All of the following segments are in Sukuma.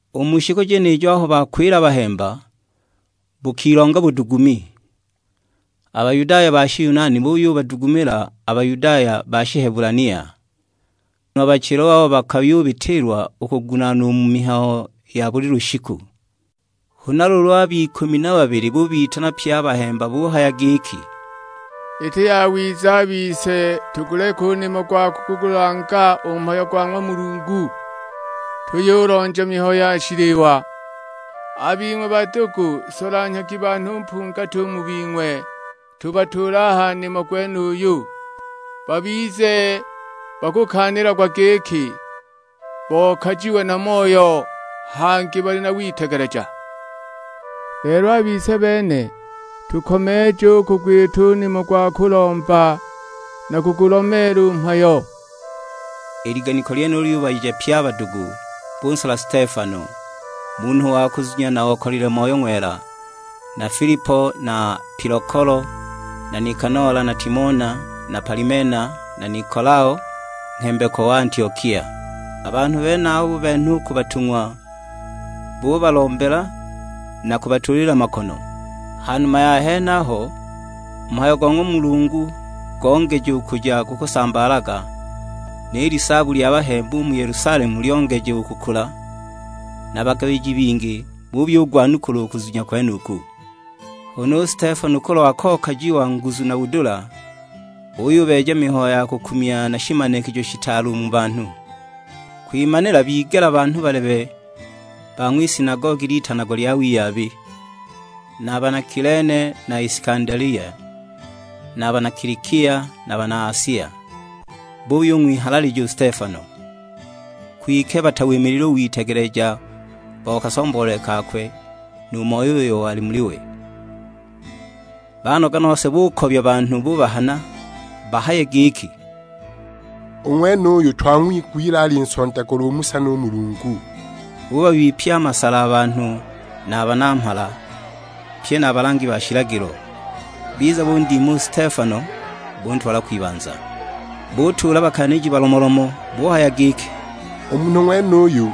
U mu shiku jenijo aho bakwila a bahemba, bukilonga budugumi. A Bayudaya ba Shiyunani buyubadugumila a Bayudaya ba Shihebulania, nguno a bachilwa babo bakayubitiilwa u kugunaanwa u mu mihayo ya buli lushiku. Huna luulu ab'ikumi na babili bubitana pye a bahemba buhaya giki, "Iti yawiza a bise tuguleke u nimo gwa kugulanga u mhayo go ng'wa Mulungu, tuyulonja mihayo ya shiliwa. A bing'we badugu solanhyagi banhu mpungati u mu bing'we, tubatuule a ha nimo gwenuyu. Babize bakukaanilagwa giki bokajiwe na Moyo, hangi bali na witegeleja. Lelo a bise bene tukomeeje u kugwita u nimo gwa kulomba na kugulomeela u mhayo." I liganiko lyenilo lyubayeja pye a badugu; bunsola Stefano, munhu wa kuzunya na okalile Moyo Ng'wela, na Filipo na Pilokolo na Nikanola na Timona na Palimena na Nikolao, nghembekwa wa Antiokia. A banhu benabo bubenha u ku batung'wa, bubalombela na kubatuulila makono. Ha numa ya henaho, u mhayo go ng'wa Mulungu gongeja u kuja gukusambaalaga; ni lisaabu lya bahemba u mu Yelusalemu lyongeja u kukula, na bagabiji bingi buyugwanukula u kuzunya kwenuku. Huna u Stefano kulwa kokajiwa nguzu na budula, uyubeeja mihayo ya kukumya na shimanikijo shitaale u mu banhu. Kwimanila bigela banhu balebe ba ng'wisinagogi litanagwa lya Wiyabi, na bana Kilene na Isikandelia, na bana Kilikia, na bana Asia; buyung'wihalalija u Stefano. Kwike batawimilile u witegeleja bo kasomboolele kakwe, nu Moyo uyo wali muli we. Banoga nose bukobya banhu bubahana; bahaye giki, "U ng'wenuyu twang'wigwile alinsondagula u Musa nu Mulungu!" Bubabipya a masala a banhu na a banamhala, pye na a balangi ba shilagilo; biza bundima u Stefano buntwala kwibanza. Butuula bakaaniji balomolomo; buhaya giki, "U munhu ng'wenuyu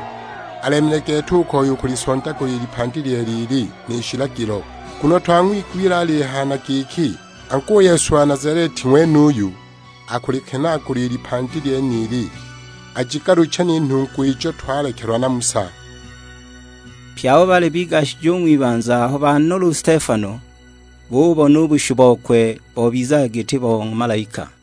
alemile gete u koya u kulisondagula i lipandi lyeela ili, ni shilagilo. Nguno twang'wigwile alihaya na giki, angu u Yesu wa Nazaleti ng'wenuyu akulikenaagula i lipandi lyenili, ajigaluche ni nhungwa ijo twalekelwa na Musa!" Pye abo baali bigashije u ng'wibanza aho banola u Stefano, bububona u bushu bokwe bobizaga giti bo ng'wa malaika.